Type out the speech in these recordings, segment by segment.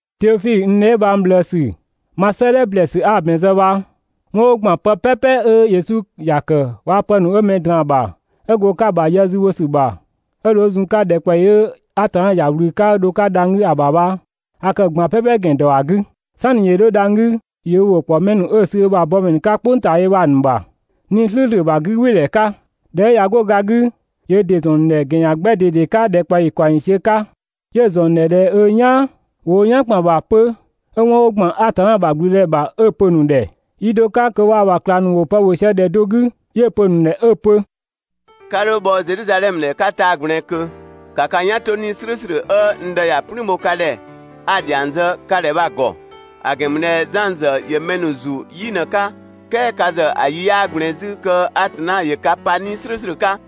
Teofidhö, n dheebhang ꞊bhlëësü, ma 'sëëdhɛ ‑blɛɛsü 'a‑ ‑bɛn zë bha, 'wɔn 'ö ‑gban pë "pɛpɛ 'ö Yesu ‑ya ‑kë waa‑ pë ‑nu 'ö mɛ ‑nu ꞊draan‑ ‑bha 'ö go‑ 'ka‑ ‑bha yë zü bho ‑sü ‑bha 'ö dho 'ö zun‑ 'ka ‑dhɛkpaɔyi 'ö Atanna ‑ya ꞊wlü 'ö dho‑ 'ka dhang‑ 'gü ‑a ‑bha bha, a kë‑ ꞊gban "pɛpɛ ‑gɛn ‑dɔ ‑a 'gü. "Sanni ‑yö 'dho dhang‑ 'gü, ‑yö ö ‑wʋ ‑kpɔ mɛ ‑nu 'ö‑ ‑nu sü ö ‑bha bɔmɛ ‑nu 'ka "kpʋng ꞊taa yö bha‑ ‑nu ‑bha 'Nii‑ "slʋ̈ʋ̈slʋ̈ ‑bha 'gügbɩɩdhɛ 'ka. ꞊Dhɛ 'ö ꞊ya 'go ga 'gü, ‑yö ö ‑dɩ ‑zɔn ‑nu ‑dhɛ ‑gɛn ‑yan 'gbɛ ꞊dede 'ka ‑dhɛkpaɔyi ‑kaɔng ‑yiisiö 'ka 'yö‑ ‑zɔn ‑nu ‑dhɛ ꞊dhɛ 'ö "yaan. ‑Wo wo "yan ‑kpan ‑bha 'pö 'ö 'wɔn 'ö ‑gban Atanna ‑bha ‑gblüdëdhɛ ‑bha 'ö‑ pö‑ ‑nu ‑dhɛ. Yi do 'ka kö waa‑ ‑bha ꞊klangdhiʋ̈ ‑nu bha ‑wo pë ‑bhö sië ‑dhɛ do 'gü, 'yö‑ pö‑ ‑nu ‑dhɛ 'ö‑ pö: «'Ka 'dho bhɔ Zedhizadhɛmö ‑dhɛ 'ka taa‑ ꞊gblɛɛn ꞊kö, ‑ka ka "yan 'to 'Nii‑ "slʋ̈ʋ̈slʋ̈ 'ö n Dë ‑ya "plüün bho ka ‑dhɛ, 'a‑ ‑dhiang zë ka ‑dhɛ bha‑ ‑gɔ! ‑A ‑gɛn ‑mü ꞊dhɛ Zan ‑zë ‑yö mɛ ‑nu ‑zu "yi ꞊në‑ 'ka, "kɛɛ ka ‑zë ‑a yi 'yaa ꞊gblɛɛn 'zü kö Atanna ‑yö ka pa 'Nii‑ "slʋ̈ʋ̈slʋ̈ 'ka.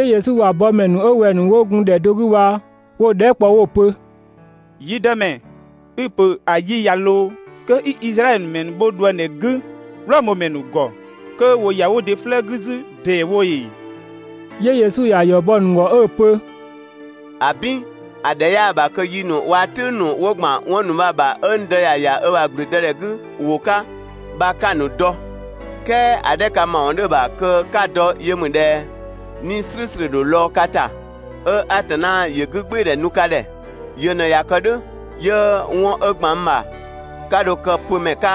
Yesu ‑bha bɔmɛ ‑nu 'ö wɛng‑ ‑nu 'wo gun ‑dhɛ do 'gü bha, 'wo‑ dhɛɛ" kpɔ 'wo‑ pö: «Yi Dëmɛ, i‑ ‑pö ‑a yi ꞊ya ‑loo kö 'i Izraɛdhö ‑mɛ ‑nu bho ꞊dhuëngdhɛ 'gü (Wlɔmö ‑mɛ ‑nu ‑gɔ) kö ‑wo ‑ya wo ‑dɩ 'flëë‑ 'gü 'zü ‑deewo ‑ee?» 'Yö Yesu ‑ya ‑yɔ bɔ‑ ‑nu ‑gɔ 'ö‑ pö: «‑Abin! ‑A ‑dhɛ 'yaa‑ ‑bha kö yi ‑nu waa‑ "tʋ̈ng ‑nu ('wo ‑gban 'wɔn ‑nu bha‑ ‑bha) 'ö n Dë ‑ya ‑ya ö ‑bha ‑gblüdëdhɛ 'gü ‑wʋ 'ka bha 'ka‑ ‑nu dɔ. "Kɛɛ (‑a 'dhɛ ka ‑mawɔn 'dhö‑ ‑bha kö 'ka‑ dɔ yö ‑mü ꞊dhɛ:) 'Nii‑ "slʋ̈ʋ̈slʋ̈ ‑dho lɔɔ‑ ka ‑ta 'ö Atanna ‑yö 'gügbɩɩdhɛ nu ka ‑dhɛ. Yö ꞊në ꞊ya kë "dhʋ̈ 'yö 'wɔn 'ö ‑gban n ‑bha 'ka dho kë‑ pö ‑mɛ 'ka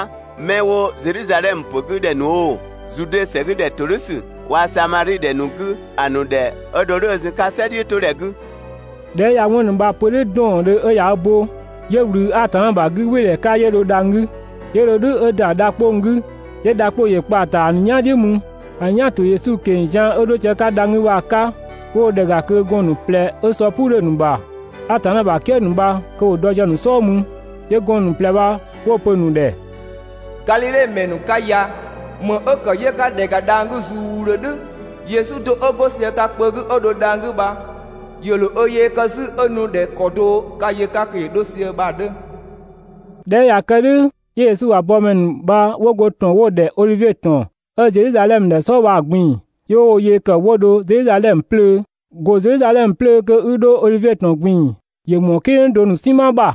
'mɛ 'wo Zedhizadhɛmö pö 'gü ‑dhɛ ‑nu oo, Zude ‑sɛ 'gü ‑dhɛ ‑todhʋ̈sü waa‑ Samadhi ‑dhɛ ‑nu 'gü ‑a ‑nu ‑dhɛ 'ö dho "dhʋ̈ 'ö zun‑ 'ka "sɛ "dhiʋ̈todhɛ 'gü.» ꞊Dhɛ 'ö ꞊ya 'wɔn ‑nu bha‑ pö "dhʋ̈ 'dɔɔndhö 'ö ꞊ya ö bo, 'yö ꞊wlü Atanna ‑bha 'gügbɩɩdhɛ 'ka 'yö dho dhang‑ 'gü, 'yö dho "dhʋ̈ 'ö ‑da dha 'kpong‑ 'gü, 'yö dha 'kpong‑ ‑yö kpa‑ ‑ta ‑a ‑nu "yan "dhiʋ̈ mü. ‑A ‑nu "yan‑ ‑to Yesu ꞊keng‑ zian 'ö 'dho sië‑ 'ka dhang‑ 'gü bha‑ 'ka, 'wo dho ‑dhɛ ‑ga kö gɔɔn‑ ‑nu ꞊plɛ 'ö sɔ "puu 'dhö‑ ‑nu ‑bha (Atanna ‑bha "kië ‑nu bha) kö ‑wo dɔ sië‑ ‑nu "sɔɔ mü. 'Yö gɔɔn‑ ‑nu ꞊plɛ bha 'wo‑ pö‑ ‑nu ‑dhɛ: «Gadhidhe ‑mɛ ‑nu 'ka ya, ‑më 'ö ‑kë 'yö 'ka ‑dhɛ ‑ga dhang‑ 'gü zuudhö "dhʋ̈? Yesu do 'ö 'go sië ka kpö 'gü 'ö dho dhang‑ 'gü bha, ‑yö ‑dho ö yee kë 'zü 'ö nu ꞊dhɛ ‑kɔ do 'ka‑ yö‑ 'ka kö ‑yö 'dho sië bha‑ 'dhö. ꞊Dhɛ 'ö ꞊ya kë "dhʋ̈ 'yö Yesu ‑bha bɔmɛ ‑nu bha 'wo go ‑tɔn 'wo‑ ‑dhɛ Odhivie ‑tɔn 'ö Zedhizadhɛmö ‑dhɛ "sɔɔ bha‑ ꞊gbin‑, 'yö 'wo wo yee ‑kë 'wo dho Zedhizadhɛmö 'plöö. ‑Go Zedhizadhɛmö 'plöö kö 'i dho Odhivie ‑tɔn ꞊gbin‑ ‑yö ‑mɔɔ "kidhʋng do ‑nu "sinma ‑bha.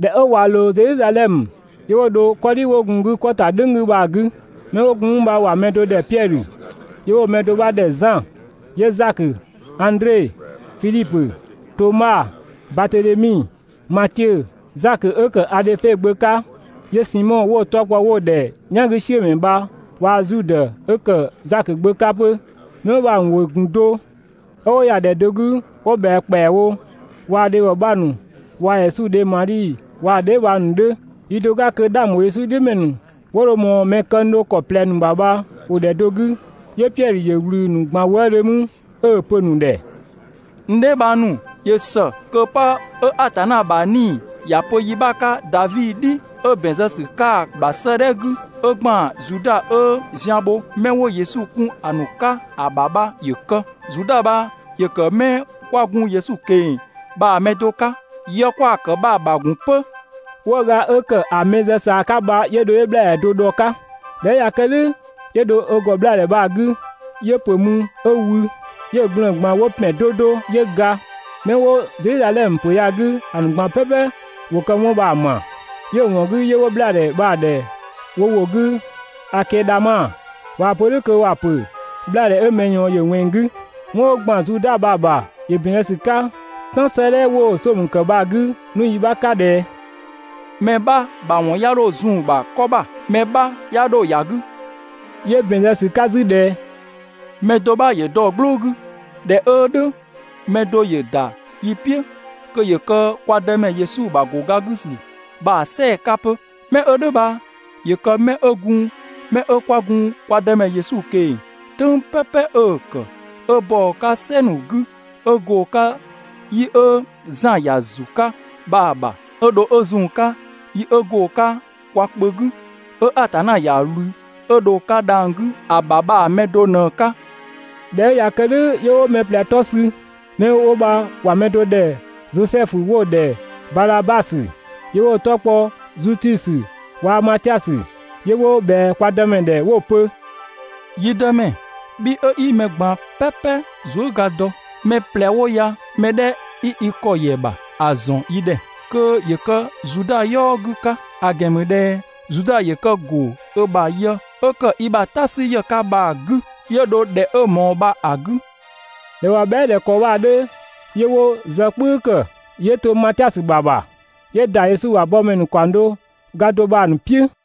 ꞊Dhɛ 'ö ꞊wa ‑loo Zedhizadhɛmö, 'yö 'wo dho 'kɔdhi 'wo gun‑ 'gü 'kɔ ‑ta "dhʋ̈ng 'gü bha‑ 'gü. 'Mɛ 'wo gun mü bha ‑wa mɛ do ‑dhɛ Piɛdhö, 'yö 'wo‑ mɛ do 'bha ‑dhɛ Zan, 'yö Zakö, Andre, Fidhipö, Toma, Batedhemi, Matiö, Zakö 'ö ‑kë Adhöfe gbö 'ka, 'yö Simɔ, 'wo‑ 'tɔ kpɔ 'wo‑ ‑dhɛ "yangüsiʋ̈mɛ bha waa‑ Zudë 'ö ‑kë Zakö gbö 'ka 'pö. 'Mɛ 'wo bha‑ ‑nu ‑wʋ ‑gun do 'ö 'wo ‑yɛa do 'gü 'wo ꞊bhɛa ‑kpɛawo, waa‑ dhebhɔ 'bha ‑nu waa‑ Yesu dhe Madhi waa‑ dheebhang ‑nu 'dhö. Yi do 'ka kö 'dhang ‑bho Yesu "dhiʋ̈ ‑mɛ ‑nu 'wo dho ꞊mɔɔ mɛ këng do ö ‑kɔ ꞊plɛ ‑nu ‑bha bha ‑wo ‑dhɛ do 'gü, 'yö Piɛdhö ‑yö ꞊wlü‑ ‑nu ꞊gban wëëdhö mü 'ö‑ pö‑ ‑nu ‑dhɛ: «N dheebhang ‑nu, ‑yö ‑së kö 'pë 'ö Atanna ‑bha 'Nii‑ ‑ya pö yi 'bha 'ka Davi "dhi 'ö ‑bɛn zë ‑sü 'ka‑ ‑bha 'sëëdhɛ 'gü, 'ö ‑gban Zuda 'ö zian bho 'mɛ 'wo Yesu kun ‑a ‑nu 'ka ‑a ‑bha bha ‑yö kë. Zuda bha ‑yö ‑kë 'mɛ 'kwa gun Yesu ꞊keng‑ bha‑ mɛ do 'ka, yë 'kwa‑ ‑kë bha‑ ‑bha ‑gun 'pö. 'Wëëga 'ö ‑kë ‑a mɛ zë ꞊saa 'ka bha 'yö 'bhlaadhɛ do dhɔ‑ 'ka. ꞊Dhɛ 'ö ꞊ya kë "dhʋ̈, 'yö dho ö ‑gɔ 'bhlaadhɛ bha‑ 'gü 'yö‑ ‑pö mü 'ö wü, 'yö‑ gblëën‑ ꞊gban 'wo ‑pɛn 'do 'do, 'yö ga. 'Mɛ 'wo Zedhizadhɛmö ‑pö ya‑ 'gü ‑a ‑nu ꞊gban "pɛpɛ ‑wo kë 'wɔn bha‑ ma, 'yö‑ ‑wɔn 'gü 'yö 'wo 'bhlaadhɛ bha‑ ‑dhɛ wo ‑wʋ 'gü Akɛdama (꞊waa‑ pö "dhʋ̈ kö ‑wa ‑pö 'bhlaadhɛ 'ö mɛ ꞊yɔɔn ‑yö ꞊wɛnng‑ 'gü). 'Wɔn 'ö ‑gban Zuda ‑bha bha ‑yö ‑bɛn zë ‑sü 'ka "Tan 'sëëdhɛ ('wo‑ Somö kë bha‑) 'gü 'nu yi 'bha 'ka ꞊dhɛ: «Mɛ 'bha ‑bha ‑wɔn 'ya 'dho zun‑ ‑bha 'kɔ ‑bha, mɛ 'bha 'ya 'dho ‑ya 'gü.» 'Yö ‑bɛn zë ‑sü 'ka 'zü ꞊dhɛ: «Mɛ do 'bha ‑yö dɔ‑ "gblʋʋ 'gü». ꞊Dhɛ 'ö "dhʋ̈ mɛ do ‑yö ‑da yi "piʋ̈ kö ‑yö kë kwa Dëmɛ Yesu ‑bha ‑go ga 'gü ‑sü bha‑ "sɛɛ‑ 'ka 'pö. Mɛ 'ö "dhʋ̈ bha ‑yö kë 'mɛ 'ö gun 'mɛ 'ö 'kwa gun kwa Dëmɛ Yesu ꞊keng‑ "tʋ̈ng "pɛpɛ 'ö‑ ‑kë, 'ö bɔ‑ 'ka "sɛ ‑nu 'gü 'ö go‑ 'ka yi 'ö Zan ‑ya ‑zu 'ka bha‑ ‑bha 'ö dho 'ö zun‑ 'ka yi 'ö go‑ 'ka kwa kpö 'gü, 'ö Atanna ‑ya ꞊wlü 'ö dho‑ 'ka dhang‑ 'gü ‑a ‑bha bha‑ mɛ do ꞊në‑ 'ka. ꞊Dhɛ 'ö ꞊ya kë "dhʋ̈ 'yö 'wo mɛ ꞊plɛ 'tɔ sü, mɛ 'wo bha ‑wa mɛ do ‑dhɛ Zosɛfu 'wo‑ ‑dhɛ Baazabasö, 'yö 'wo‑ 'tɔ kpɔ Zutusö, waa‑ Matiasö. 'Yö 'wo ꞊bhɛa kwa Dëmɛ ‑dhɛ 'wo‑ pö: «Yi Dëmɛ, bhi 'ö 'i mɛ ꞊gban "pɛpɛ zuëga dɔ, mɛ ꞊plɛ 'wo ya‑ mɛ 'dhɛ 'i i ‑kɔ ‑yɛ ‑bha ‑a ‑zɔn yi ‑dhɛ kö ‑yö kë Zuda "yɔɔ 'gü 'ka! ‑A ‑gɛn ‑mü ꞊dhɛ Zuda ‑yö kë ‑go ö ‑bha yë 'ö ‑kë i ‑bha "ta 'sü ‑yë 'ka bha‑ 'gü 'yö dho ‑dhɛ 'ö‑ ꞊mɔɔ bha‑ 'gü. ꞊Dhɛ ꞊wa bhɛa" ꞊dhɛ ‑kɔ bha‑ 'dhö 'yö 'wo zë "kpʋ̈ü ‑kë, 'yö to Matiasö ‑bha ‑bha, 'yö ‑da Yesu ‑bha bɔmɛ ‑nu ‑kaɔng do ga do bha‑ ‑nu "piʋ̈.